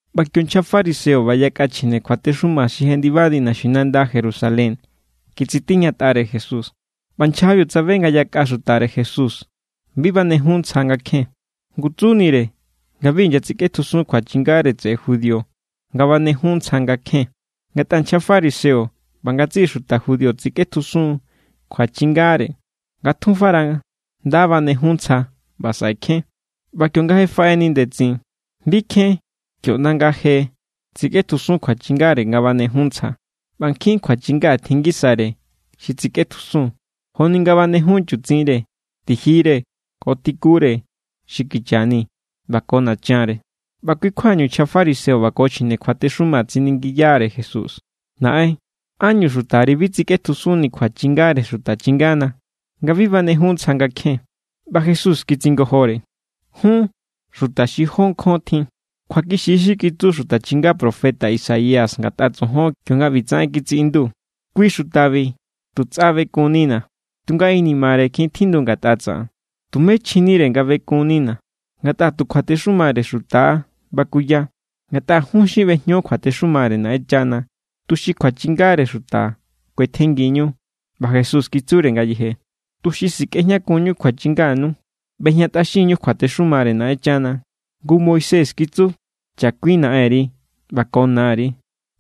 ꞌBa kio nchja fariseo ꞌba yakꞌa chjine kjuatexuma xi jendibani naxinanda Jerusalén kitsitiñatꞌare Jesús. ꞌBa nchjabiu tsabe nga yakꞌa xutare Jesús bi banejun ntsja nga kjen. Ngu tsunire nga bi inyatsikꞌetjusun kjuachingare tseꞌe judío nga banejun ntsja nga kjen. (Ngatꞌa nchja fariseo ꞌba ngatsiꞌi xuta judío tsikꞌetjusun kjuachingare nga tjunfara nda banejun ntsja ꞌba saꞌe kjen. ꞌBa kionga je faꞌeni ndetsin, bi kjen kio ꞌnda nga̱ je tsikꞌetjusun kjuachingare nga banejun ntsja. ꞌBa nkjin kjuachinga tjin ngisare xi tsikꞌetjusun, joni nga banejun chutsinre, tijire, ko tikure xi kicha ni ꞌba ko nachanre.) ꞌBa kui= kjuañu, nchja fariseo ꞌba ko chjine kjuatexuma tsiningiyare Jesús: —Naꞌen, ¿ánñu xutari bi tsikꞌetjusunni kjuachingare xuta chingana, nga bi banejun ntsja nga kjen? ꞌBa Jesús kitsingojore: —Jun, ¡xuta xi jó nkjon tjin! Kjuakixi= xi kitsu xuta chinga profeta Isaías ngatꞌa tsojon, kionga ꞌbitsaꞌen kitsiꞌindu: Kui= xutabi tu tsꞌa bekunnina̱, tunga inimare kjin tjindu ngatꞌa tsaꞌan. Tumé chjinire nga bekunnina̱, ngatꞌa tu kjuatexumare xuta= bakuya. Ngatꞌa jun xin ꞌbejño kjuatexumare Naꞌenchana tuxi kjuachingare xuta kuetjenngiñu. ꞌBa Jesús kitsure ngayeje: —Tuxi sikꞌejñakunñu kjuachinganu, ꞌbejñatꞌaxinñu kjuatexumare Naꞌenchana. Ngu Moisés kitsu: “Chakuin naꞌenri ꞌba ko nari”,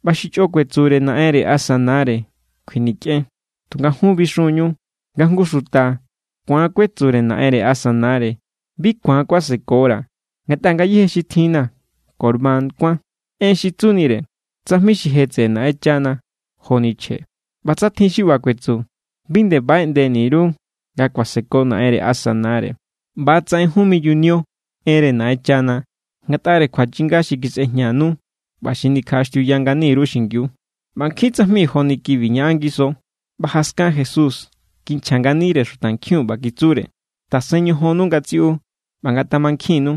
ꞌba “Xi chꞌo kuetsure naꞌenre asa nare, kjuinikꞌen”. Tunga jun bixun=ñu nga jngu xuta ku̱an kuetsure naꞌenre asa nare: “Bi ku̱an kuasekora̱, ngatꞌa ngayéje xi tjinna̱ Corbán kuán” (en xi tsunire: tsajmi xi je tseꞌe Naꞌenchana joni chje); ꞌba tsa tjin xi ꞌba kuetsu, bi nde baꞌeꞌndeni_ru nga kuaseko naꞌenre asa nare. ꞌBa= tsaꞌen, jun miyuniu enre Naꞌenchana ngatꞌare kjuachinga xi kisꞌejñanu ꞌba xi nikjaꞌaxtiuya ngani_ru xingiu. ꞌBa nkjin tsajmi joni kibi ñaꞌan ngiso. ꞌBa jaskan Jesús kinchja nganire xutankjiun, ꞌba kitsure: —Tasen ñojonnu ngatsiꞌu, ꞌba ngatamankjinnu: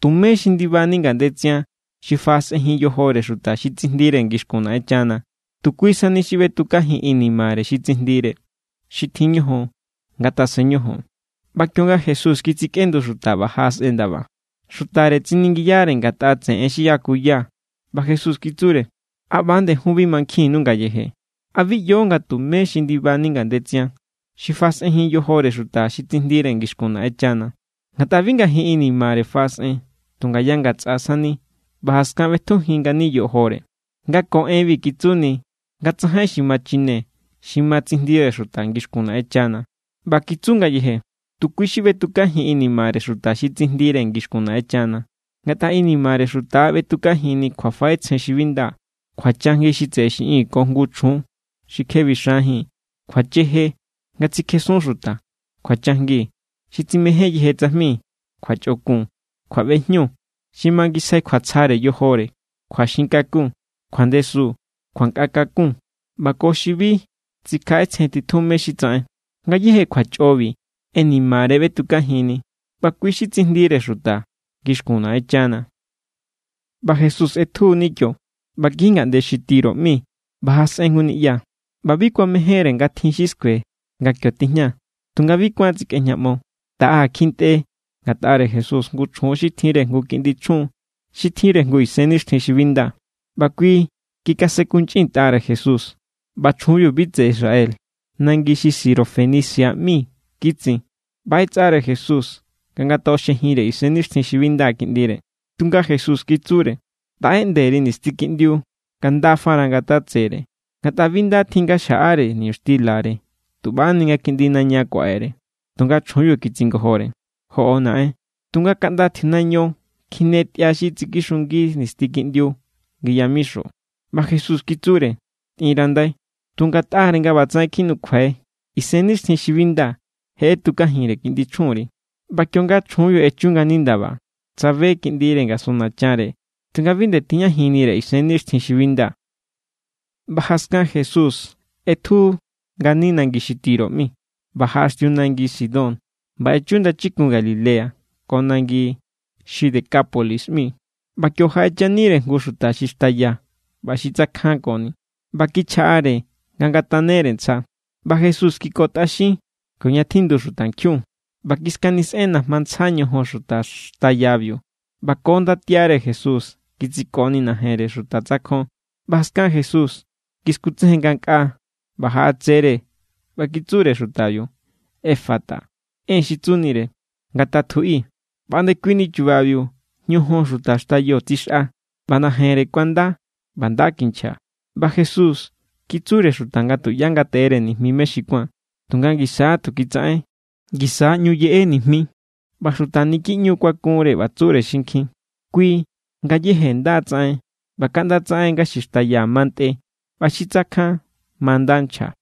Tumé xi ndibani ngandetsian xi faꞌasꞌejin yojore xuta xi tsijndire ngixkun Naꞌenchana. Tu kui sani xi ꞌbetukajin inimare xi tsijndire. Xi tjin ñojon, ngatasen ñojon. ꞌBa kionga Jesús kitsikꞌendu xuta ꞌba jaꞌasꞌen ndaba, xutare tsiningiyare ngatꞌa tseꞌe en xi yakuya. ꞌBa Jesús kitsure: —¿A ꞌba=nde jun bi mankjinnu ngayeje? ¿A bi ꞌyo nga tumé xi ndibani ngandetsian xi faꞌasꞌenjin yojore xuta xi tsijndire ngixkun Naꞌenchana? Ngatꞌa bi ngajin inimare faꞌasꞌen, tu ngaya ngatsꞌa sani, ꞌba jaskan ꞌbetukajin ngani yojore. Nga ko enbi kitsuni nga tsajain xi ma chine xi ma tsijndire xuta ngixkun Naꞌenchana. ꞌBa kitsu ngayeje: —Tu kui xi ꞌbetukajin inimare xuta xi tsijndire ngixkun Naꞌenchana. Ngatꞌa inimare xuta= ꞌbetukajinni: kjuafaꞌetsjen xi bi nda, kjuachajngi xi tseꞌe xiꞌin ko jngu chjun xi kje bixanjín, kjuacheje, nga tsikjesun xuta, kjuachajngi, xi tsimején yeje tsajmi, kjuachꞌokun, kjuaꞌbejñu, xi mangisjai kjuatsjare yojore, kjuaxinkakun, kjuandesun, kjuankꞌatakun, ꞌba ko xi bi tsikjaꞌetsjen titjun mé= xi tsaꞌen. Ngayéje kjuachꞌobi inimare= ꞌbetukajinni, ꞌba kui= xi tsijndire xuta ngixkun Naꞌenchana. ꞌBa Jesús ꞌetjuni kio ꞌba kiji ngaꞌnde xi Tiro ꞌmi ꞌba jaꞌasꞌen jngu niꞌya. ꞌBa bi kuamejénre nga tjin xi skue nga kio tijña; tunga bi kuán tsikꞌejñaꞌmo. Taꞌa kjintꞌe ngatꞌare Jesús jngu chjun xi tjinre jngu kiꞌndi chjun xi tjinre jngu isennixtjin xi bi nda; ꞌba kui kikasenkunchꞌintꞌare Jesús. ꞌBa chjunbiu bi tseꞌe Israel, nangi xi Sirofenicia ꞌmi kitsin. ꞌBa ꞌetsꞌare Jesús nga ngatoꞌoxjejinre isennixtjin xi bi nda kiꞌndire. Tunga Jesús kitsure: —Taꞌeꞌnde_ri nisti kiꞌndiu nga nda fara ngatatsere, ngatꞌa bi nda tjin nga xjaꞌare niñuxtilare tu ꞌbani nga kiꞌndi naña kuaꞌere. Tunga chjunbiu kitsingojore: —Joꞌo, naꞌen; tunga kaꞌnda tjiunaño kjine tꞌia xi tsikixungi nisti kiꞌndiu ngi yamixo. ꞌBa Jesús kitsure: —Tꞌinrandai, tu ngatꞌare nga ꞌba tsaꞌen kjinukjuai, isennixtjin xi bi nda je ꞌetukajinre kiꞌndi chjunri. ꞌBa kionga chjunbiu echu ngani ndaba, tsabe kiꞌndire ngasun nachanre, tunga bi nde tijñajinnire isennixtjin xi bi nda. ꞌBa jaskan Jesús ꞌetju ngani nangi xi Tiro ꞌmi, ꞌba jaꞌaxtiu nangi Sidón ꞌba echu ndachikun Galilea ko nangi xi Decápolis ꞌmi. ꞌBa kio jaꞌechanire jngu xuta xi xtaya ꞌba xi tsakjankoni, ꞌba kichjaꞌare nga ngatanere ntsja. ꞌBa Jesús kikotꞌaxin kioña tjindu xutankjiun, ꞌba kiskanisꞌen najma ndsa ñojon xuta xtayabiu. ꞌBa ko ndatiare Jesús kitsiko najenre xuta tsakjon. ꞌBa jaskan Jesús kiskutsejen ngankꞌaa ꞌba jaꞌatsere, ꞌba kitsure xutabiu: —Efata. (En xi tsunire: ¡Ngatatjuꞌi!) ꞌBa ndekuini chubabiu ñojon xuta xtayo tsixꞌa, ꞌba najenre kuanda ꞌba nda kinchja. ꞌBa Jesús kitsure xuta nga tuꞌyá ngateꞌere nijmi mé= xi kuán; tunga ngisa= tu kitsaꞌen, ngisa= ꞌñu yeꞌe nijmi. ꞌBa xuta niki ꞌñu= kuakunre, ꞌba tsure xinkjin: —Kui ngayéje nda tsaꞌen ꞌba kaꞌnda tsaꞌen nga xi xtaya ma ntꞌe ꞌba xi tsakjan ma nda nchja.